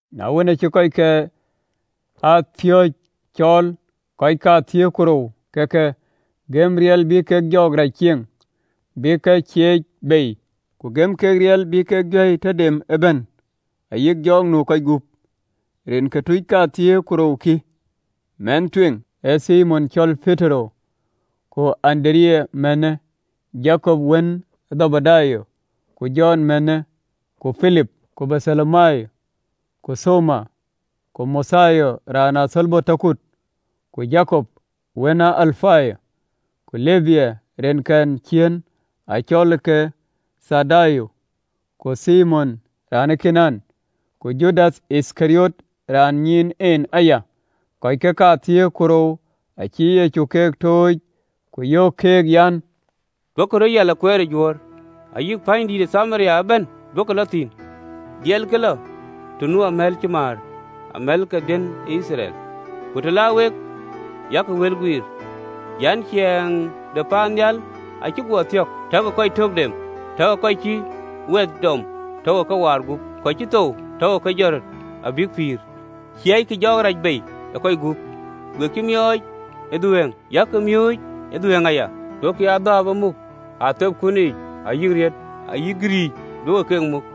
Na wën, aacï kɔckɛn ë piööcë cɔɔl, kɔc kathiëër ku rou, ke ke gëm riɛl bï kek jɔɔk rac cieŋ, bïk ke ciëëc bei, ku gëm keek riɛl bï kek juäi tɔ dem ëbɛ̈n ayï jɔɔk nu ë kɔc gup. Rin ke tuuc kathiëër ku rou kï, mɛnh tueŋ, ee Thimon, acɔl Petero, ku Andereya mänhë, Jakop wën ë Dhebedayo, ku Jɔn mänhë, Ku Pilip, ku Bartholomayo, ku Thoma, ku Mathayo raan ë athölbö tɔ kut, ku Jakop wën ë Alapayo, ku Lebbia, rinkɛn ciëën acɔlke Thɔddayo, Ku Thimon raan ë Kanaan, ku Judath Yithkariɔt, raan ë nyiin en aya. Kɔckë kathiëër ku rou acï Yecu ke tooc, ku yöök keek an, “Duökï röt yiɛl ë kueer ë Juöör, ayï pänydïït ë Thamaria ëbɛ̈n duökï lɔ thïn, dhiɛlkï lɔ të nu amɛ̈l cï määr, amɛ̈l ke baai de Yithriɛl. Ku të la wek, yak wël guiir an, ‘Ciɛɛŋ de paannhial acï guɔ thiɔ̈k.’ Takï kɔc tök dem, takï kɔc cïï wɛth dɔm takï ke waar gup, kɔc cï thou takï ke jɔt röt abïk pïïr, ciëëckï jɔɔk rac bei ë kɔc gup, we cï miɔɔc ë dhuëëŋ, yak miööc ë dhuëëŋ aya. Duökï adhääp ë muk ë atheepkun yiic, ayï atek, ayï ayöm, duökï keek ë muk,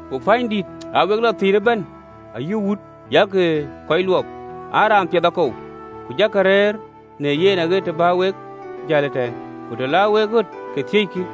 Ku pänydïït aa wek lɔ thïn ëbɛ̈n, ayï wut, yak kɔc luɔp, an, Raan piɛth akou? Ku jakï rëër në yen aɣet të bä wek jäl ëtɛ̈ɛ̈n. Ku të la wek ɣöt, ke thiëckï.